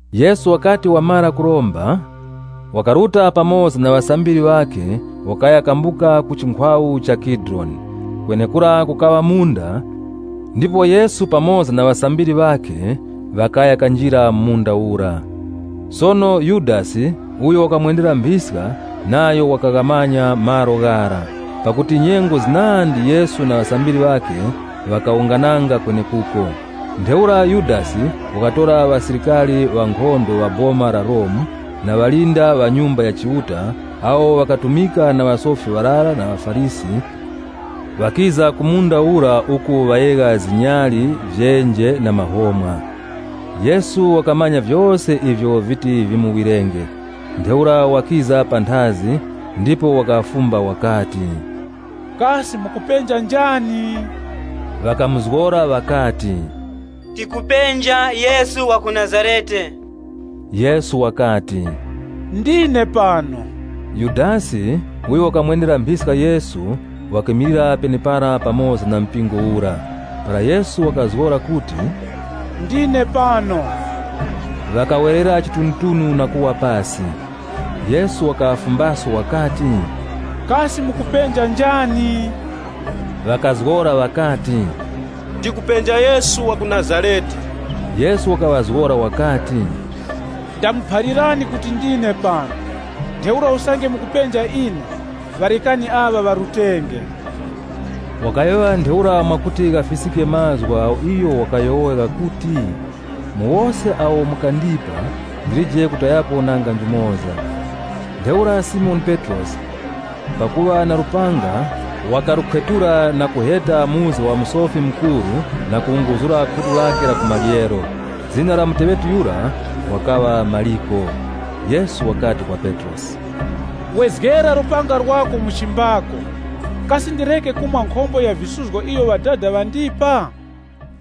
Yesu wakati wamara kuromba, wakaruta pamoza na ŵasambiri ŵakhe wakaya kambuka ku chinkhwawu cha Kidironi. Kwenekura kukaŵa munda, ndipo Yesu pamoza na ŵasambiri ŵakhe ŵakaya kanjira mu munda ura. Sono Yudasi uyo wakamwendera mphiska nayo wakaghamanya malo ghara, pakuti nyengo zinandi Yesu na ŵasambiri ŵakhe ŵakawungananga kwenekuko. Ntheura Yudasi wakatora mpingo wa ŵasilikari ŵa Boma la Romu na ŵalinda ŵa Nyumba ya Chiuta awo ŵakatumika na ŵasofi ŵarara na ŵaFarisi, ŵakiza ku munda ura uku ŵayegha zinyali, vyenje na mahomwa. Yesu wakamanya vyose ivyo viti vimuwirenge. Ntheura wakiza panthazi ndipo wakaŵafumba wakati, “Kasi mukupenja njani?” Ŵakamuzgora ŵakati, “Tikupenja Yesu wa ku Nazarete.” Yesu wakati, “Ndine pano.” (Yudasi uyo wakamwendera mphiska Yesu wakimilira penepara pamoza na mpingo ura.) Para Yesu wakazgora kuti, “Ndine pano,” ŵakawerera chitunutunu na kuwa pasi. Yesu wakaŵafumbaso wakati, “Kasi mukupenja njani?” Ŵakazgora ŵakati, “Tikupenja Yesu wa ku Nazarete.” Yesu wakaŵazgora wakati, “Ndamuphalirani kuti ndine pano. Ntheura usange mukupenja ine, ŵarekani aŵa ŵarutenge.” Wakayowoya ntheura mwakuti ghafiskike mazgu agho iyo wakayowoya ghakuti, “Mu wose awo mukandipa, ndilije kutayapo nanga njumoza.” Ntheura Simoni Petrosi pakuŵa na lupanga, wakalukhwetula, na kuheta muzga wa Musofi Mukuru na kuwunguzura khutu lakhe la ku maryero. Zina la muteŵeti yura wakaŵa Maliko. Yesu wakati kwa Petrosi, “Wezgera lupanga lwako mu chibazi chakhe. Kasi ndireke kumwa nkhombo ya visuzgo iyo Ŵadada ŵandipa?”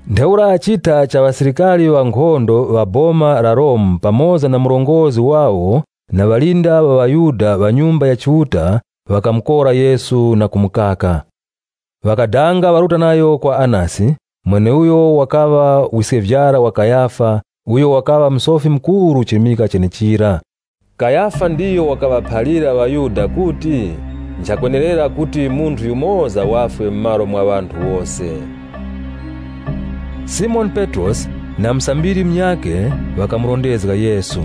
Ntheura mpingo wa ŵasilikari ŵa Boma la Romu pamoza na murongozgi wawo na ŵalinda ŵa ŵaYuda ŵa Nyumba ya Chiuta, ŵakamukora Yesu na kumukaka. Ŵakadanga ŵaruta nayo kwa Anasi, mweneuyo wakaŵa wiskevyara wa Kayafa uyo wakaŵa Musofi Mukuru chirimika chenechira. Kayafa ndiyo wakaŵaphalira ŵaYuda kuti, nchakwenerera kuti munthu yumoza wafwe mu malo mwa ŵanthu wose. Simoni Petrosi na musambiri munyakhe ŵakamurondezga Yesu.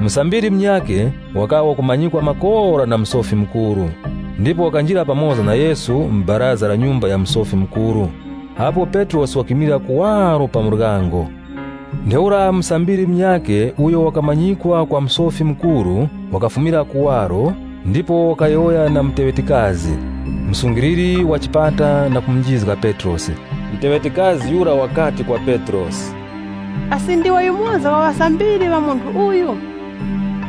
Musambiri munyakhe wakaŵa wakumanyikwa makora na Musofi Mukuru. Ndipo wakanjira pamoza na Yesu mu baraza la nyumba ya Musofi Mukuru, apo Petrosi wakimilira kuwaro pa muryango. Ntheura musambiri munyakhe uyo wakamanyikwa kwa Musofi Mukuru, wakafumira kuwaro ndipo wakayowoya na msungwana wanchito, mulinda wa pa muryango, na kumunjizga Petrosi. Msungwana wanchito yura wakati kwa Petrosi, “Asi ndiwe yumoza wa ŵasambiri ŵa munthu uyu?”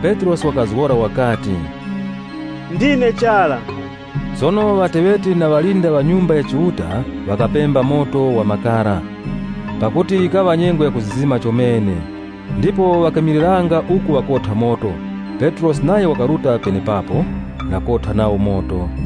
Petrosi wakazgora wakati, “Ndine chara.” Sono ŵateŵeti na ŵalinda ŵa Nyumba ya Chiuta ŵakapemba moto wa makara, pakuti yikaŵa nyengo ya kuzizima chomene. Ndipo ŵakimiliranga uku ŵakotha moto, Petrosi nayo wakaruta penepapo na kotha nawo moto.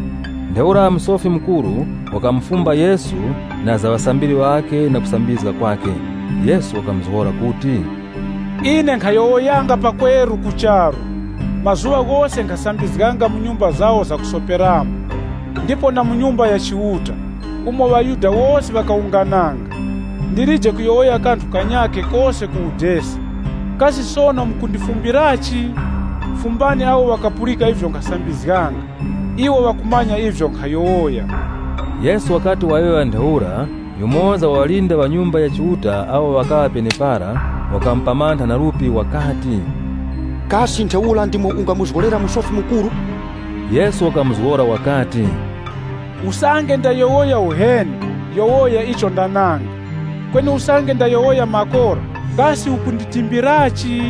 Ntheura Musofi Mukuru wakamufumba Yesu na za ŵasambiri ŵakhe na kusambizga kwakhe. Yesu wakamuzgora kuti, “Ine nkhayowoyanga pakweru ku charu. Mazuŵa ghose nkhasambizganga mu nyumba zawo zakusoperamo, ndipo na mu Nyumba ya Chiuta, umo ŵaYuda wose ŵakawungananga. Ndilije kuyowoya kanthu kanyakhe kose ku udesi. Kasi sono mukundifumbirachi? Fumbani awo ŵakapulika ivyo nkhasambizganga. Iwo ŵakumanya ivyo nkhayowoya.” Yesu wakati wayowoya ntheura, yumoza wa ŵalinda ŵa Nyumba ya Chiuta awo ŵakaŵa penepara, wakamupamantha na lupi wakati, “Kasi ntheura ndimo ungamuzgolera Musofi Mukuru?” Yesu wakamuzgora wakati, “Usange ndayowoya uheni yowoya icho ndananga. Kweni usange ndayowoya makora, kasi ukunditimbirachi?”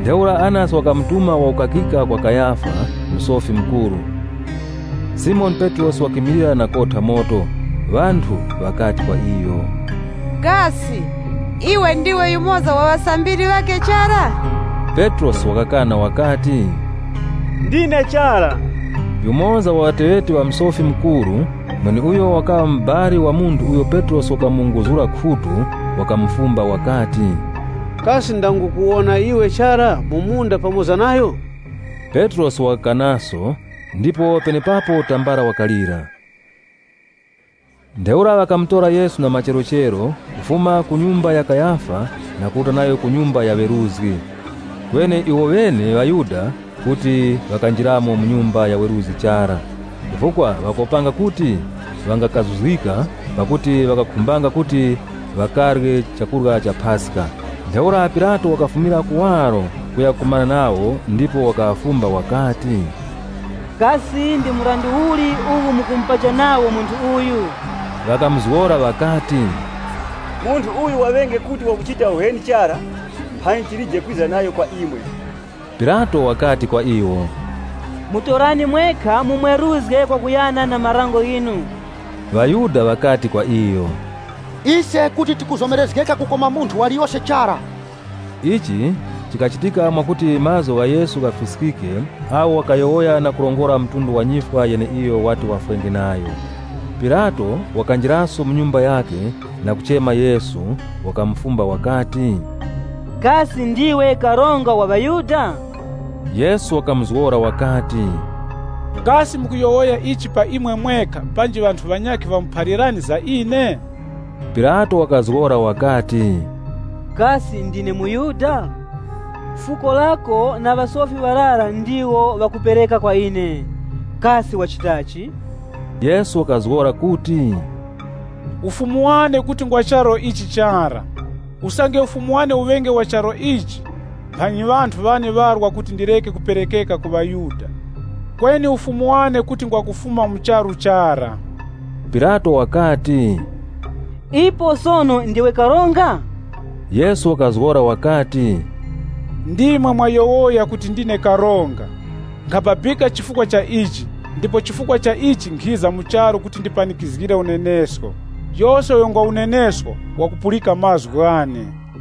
Ntheura Anasi wakamutuma wakukakika kwa Kayafa, Musofi Mukuru. Simoni Petrosi wakimilira na kotha moto. Ŵanthu ŵakati kwa iyo, “Kasi iwe ndiwe yumoza wa ŵasambiri ŵakhe chara?” Petrosi wakakana wakati, “Ndine chara.” Yumoza wa ŵateŵeti ŵa Musofi Mukuru, mweneuyo wakaŵa mubali wa munthu uyo Petrosi wakamuwunguzura khutu, wakamufumba wakati, “Kasi ndangukuwona iwe cha mu munda pamoza nayo?” Petrosi wakakanaso ndipo penepapo tambala wakalira. Ntheura ŵakamutora Yesu na macherochero, kufuma ku nyumba ya Kayafa na kuruta nayo ku nyumba ya weruzgi. Kweni iwoŵene ŵaYuda kuti ŵakanjiramo mu nyumba ya weruzgi chara, chifukwa ŵakopanga kuti ŵangakazuzgika, pakuti wakakhumbanga kuti ŵakarye chakurya cha Paska. Ntheura Pilato wakafumira kuwaro kuya kakumana nawo ndipo wakaŵafumba wakati, “Kasi ndi mrandu uli uwu mukumupacha nawo munthu uyu?” Ŵakamuzgora ŵakati, “Munthu uyu waŵenge kuti wakuchita uheni chara, mphanyi tilije kwiza nayo kwa imwe.” Pilato wakati kwa iwo, “Mutorani mwekha mumweruzge kwakuyana na marango ghinu.” ŴaYuda ŵakati kwa iyo, “Ise kuti tikuzomerezgeka kukoma munthu waliyose chara.” Ichi chikachitika mwakuti mazgu gha Yesu ghafiskike agho wakayowoya na kurongora mtundu wa nyifwa yeneiyo wati wafwenge nayo. Pilato wakanjiraso mu nyumba yakhe na kumuchema Yesu, wakamufumba wakati, “Kasi ndiwe Karonga wa ŵaYuda?” Yesu wakamuzgora wakati, “Kasi mukuyowoya ichi pa imwe mwekha panji ŵanthu ŵanyakhe ŵamuphalirani za ine?” Pilato wakazgora wakati, “Kasi ndine muYuda? Fuko lako na ŵasofi ŵarara ndiwo ŵakupereka kwa ine. Kasi wachitachi?” Yesu wakazgora kuti, “Ufumu wane kuti ngwa charu ichi chara. Usange ufumu wane uŵenge wa charu ichi, mphanyi ŵanthu ŵane ŵarwa kuti ndireke kuperekeka ku ŵaYuda. Kweni Ufumu wane kuti ngwa kufuma mu charu chara.” Pilato wakati, “Ipo sono ndiwe karonga?” Yesu wakazgora wakati, “Ndimwe mwayowoya kuti ndine karonga. Nkhababika chifukwa cha ichi ndipo chifukwa cha ichi nkhiza mu charu kuti ndipanikizgire unenesko. Yose uyo ngwa unenesko, wakupulika mazgu ghane.”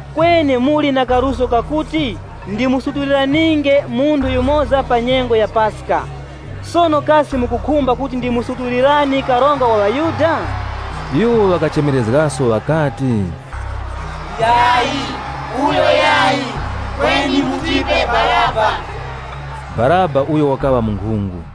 Kweni muli na kaluso kakuti ndimusutuliraninge munthu yumoza pa nyengo ya Paska, sono kasi mukukhumba kuti ndimusutulirani Karonga wa ŵaYuda?” Iwo ŵakachemerezgaso ŵakati, “Yayi! Uyo yayi, kweni Baraba!” (Baraba uyu, wakaŵa munkhungu).